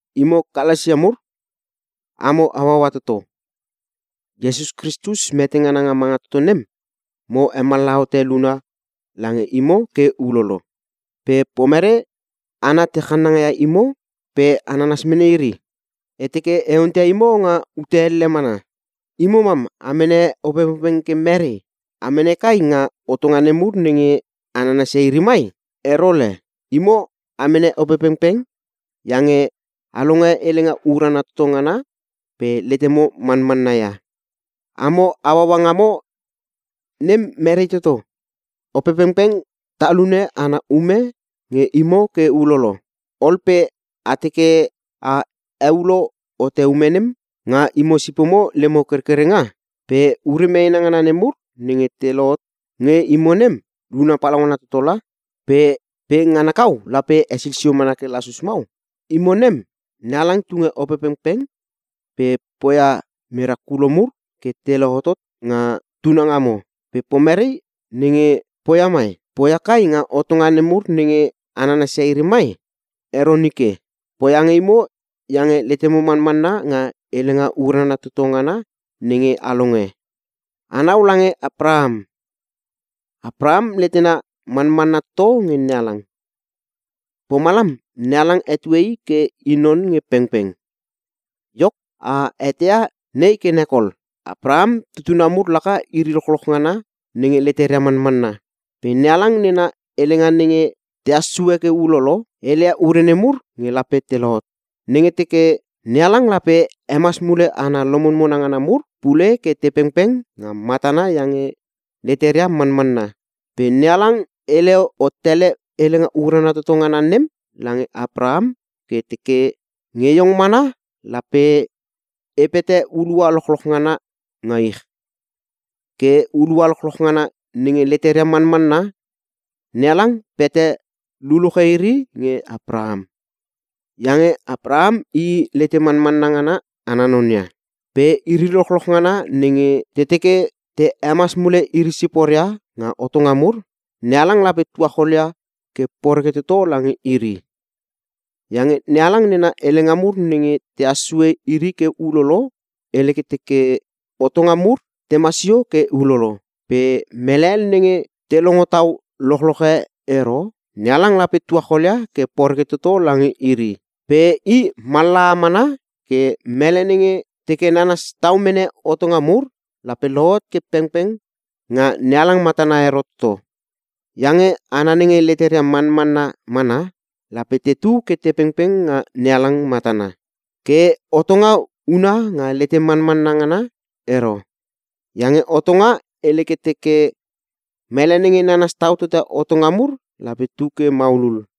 Imo Kalasia mur, amo hauaua toto. Iesus Kristus mete ngana nga manga toto nem, mo hemallaha hote luna lange imo ke ulolo. Pe pomere hana te channanga ia imo pe a nanas mene iri? E teke e onteia imo nga ute elle mana: Imo mam a mene Opepengpeng ke merei? A mene kai nga hotonga nemur nenge a nanasia iri mai? Ero le! Imo a mene Opepengpeng iange a longe Helenga Urana Toto Ngana pe letemo manmanna ia. Amo hauaua ngamo nem merei toto? Opepengpeng talune ana ume nge imo ke ulolo, ol pe a teke a heulo hote ume nem nga imo sipomo lemo kerkerenga? Pe ure meena ngana nemur nenge te lohot nge imo nem luna palaungana toto la! Pe ngana kau lape hesil sio mana ke lasus mau? Imo nem, NeHalang tunge Opepengpeng pe poia merakulo mur ke te lohotot nga tunangamo. Pe pomerei nenge poia mai? Poia kai nga hotonga nemur nenge a nanasia iri mai? Ero nike! Poia nge imo iange letemo manmanna nga Helenga Urana Toto Ngana nenge a longe. Anau lange Apraham. “Apraham letena manmanna toto nge NeHalang, pomalam NeHalang hetue i ke i non nge pengpeng.” Iok, a eteia nei ke nek ol: Apraham tutuna mur laka iri lochloch ngana nenge leteria manmanna. Pe NeHalang nena helenga nenge tehas sue ke ulolo, helelia ure nemur nge lape te lohot. Nenge teke, NeHalang lape hemas mule hana lomonmona ngana mur pule ke te pengpeng nga matana iange leteria manmanna. Pe NeHalang hele hot tele Helenga Urana Toto Ngana nem lange Apraham ke teke, “Nge iong mana lape E pete hulua lochloch ngana nga ich.” Ke hulua lochloch ngana nenge leteria manmanna, NeHalang pete luluche iri nge Apraham. Iange Apraham i lete manmanna ngana ana non ia. Pe iri lochloch ngana nenge te teke te hemas mule iri siporia nga hotonga mur, NeHalang lape tuacholia ke poreke toto lange iri. Iange NeHalang nena helenga mur nenge tehas sue iri ke ulolo, hele ke teke, “Hotonga mur tema sio ke ulolo, pe mele hel nenge te longo tau lochloche ero NeHalang lape tuacholia ke poreke toto lange iri.” Pe i mallaha mana ke mele nenge teke nanas tau mene hotonga mur, lape lohot ke pengpeng nga NeHalang matana ero toto. Iange “Hana nenge leteria manmanna mana lape tetu ke te pengpeng nga NeHalang matana.” Ke Hotonga huna nga lete manmanna ngana ero. Iange Hotonga hele ke teke, “Mele nenge nanas taua Hotonga mur lape tu ke maulul.”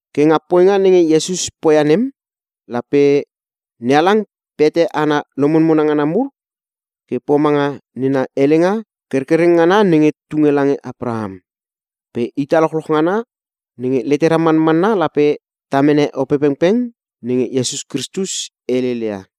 Ke nga poinga nenge Iesus poia nem, lape NeHalang pete hana lomonmona ngana mur ke pomanga nena helenga kerkereng ngana nenge tunge lange Apraham. Pe ita lochloch ngana nenge letera manmanna lape ta mene Opepengpeng nenge Iesus Kristus helele ia.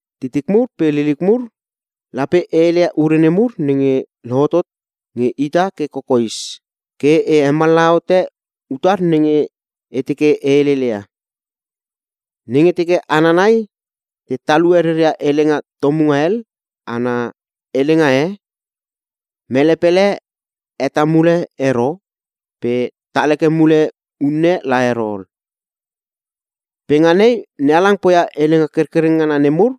Titik mur pe liliuk mur, lape e heleia ure nemur nenge lohotot nge ita ke kokoes, ke e hemallaha hote utar nenge e teke e heleleia: Nenge teke hana nai te talue reria helenga tomunga hel ana helenga e, mele pele heta mule ero pe tal heke mule unne la ero ol. Pe nga nei NeHalang poia helenga kerkereng ngana nemur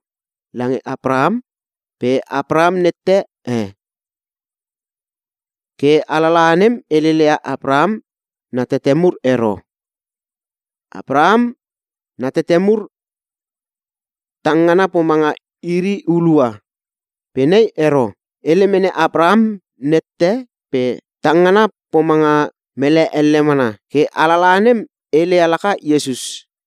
lange Apraham pe Apraham nette e. Ke Alalaha nem heleleia Apraham na tete mur ero. Apraham na tete mur tang ngana pomanga iri hulua. Pe nei ero. Hele mene Apraham nette pe tang ngana pomanga mele elle mana. Ke Alalaha nem helele ia laka Iesus.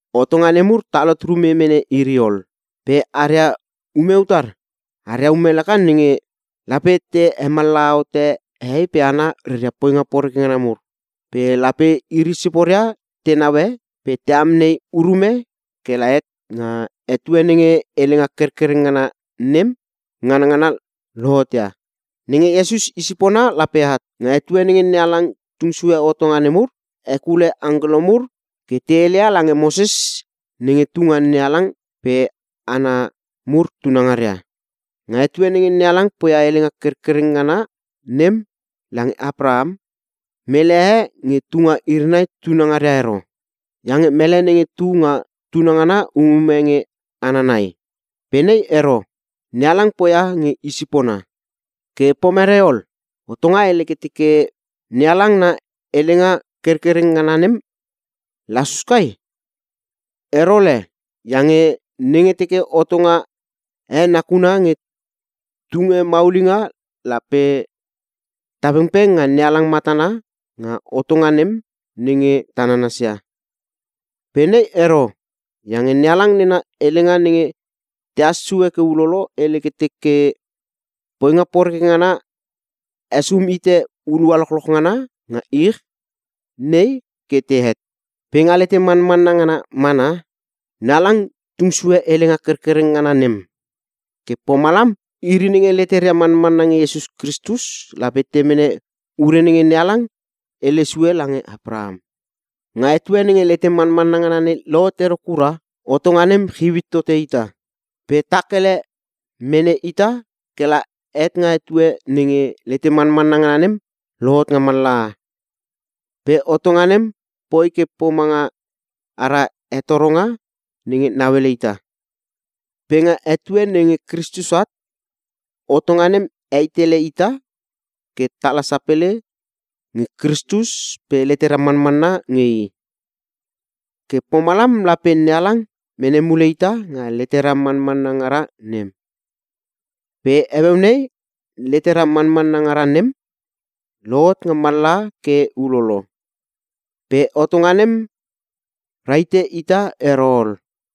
Hotonga nemur talhot rume mene iri ol, pe aria ume utar? Aria ume laka nenge: Lape te hemallaha hote hehei pe hana reria poinga poreke ngana mur. Pe lape iri siporia te naue pe te amnei urume ke la het nga etue nenge helenga kerkereng ngana nem, nganangana lohot ia. Nenge Iesus i sipona lape at. Nga etue nenge NeHalang tung sue hotonga nemur, hekule angkelo mur ke te heleia lange Moses nenge tu nga NeHalang pe hana mur tunangaria. Nga etue nenge NeHalang poia helenga kerkereng ngana nem lange Apraham, mele e nge tu nga iri nai tunangaria ero. Iange mele nenge tu nga tunangana umume nge hana nai. Pe nei ero, NeHalang poia nge Isipona. Ke pomerei ol? Hotonga hele ke teke NeHalang na helenga kerkereng ngana nem lasus kai? Ero le! Iange nenge teke hotonga e nakuna nge tunge maulinga lape ta pengpeng nga NeHalang matana nga hotonga nem nenge ta nanasia. Pe nei ero. Iange NeHalang nena helenga nenge tehas sue ke ulolo, hele ke teke, poinga poreke ngana hesum hite hulua lochloch ngana nga ich nei ke tehet. Pe nga lete manmanna ngana mana, NeHalang tung sue helenga kerkereng ngana nem. Ke pomalam iri nenge leteria manmanna nge Iesus Kristus lape te mene ure nenge NeHalang hele sue lange Apraham. Nga etue nenge lete manmanna ngana nei lohot ero kura, hotonga nem chiu it tote ita. Pe tak ele mene ita ke la het nga etue nenge lete manmanna ngana nem lohot nga mallaha. Pe hotonga nem poi ke pomanga ara hetoronga nenge nauele ita. Pe nga etue nenge Kristus at, hotonga nem hei tele ita ke tala sapele nge Kristus pe letera manmanna nge I. Ke pomalam lape NeHalang mene mule ita nga letera manmanna ngara nem. Pe heueu nei, letera manmanna ngara nem, lohot nga mallaha ke ulolo. Pe hotonga nem rahite ita ero ol.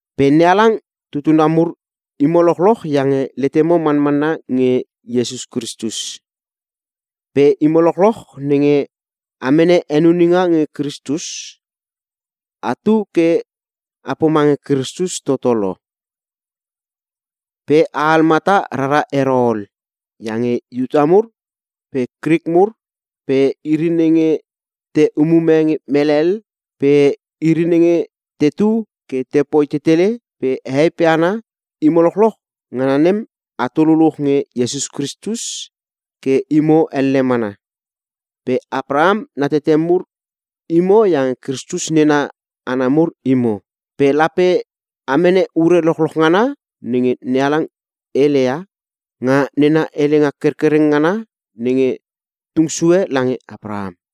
Pe NeHalang tutuna mur imo lochloch iange letemo manmanna nge Iesus Kristus. Pe imo lochloch nenge a mene henuninga nge Kristus, atu ke a pomange Kristus toto lo. Pe a al mata rara ero ol, iange Iuta mur pe Krik mur pe iri nenge te umume nge mele hel pe iri nenge tetu ke tepoi tetele pe hehei pe hana, imo lochloch ngana nem, atu luluch nge Iesus Kristus ke imo elle mana. Pe Apraham na tete mur imo iange Kristus nena hana mur imo. Pe lape a mene ure lochloch ngana nenge NeHalang heleia, nga nena helenga kerkereng ngana nenge tung sue lange Apraham.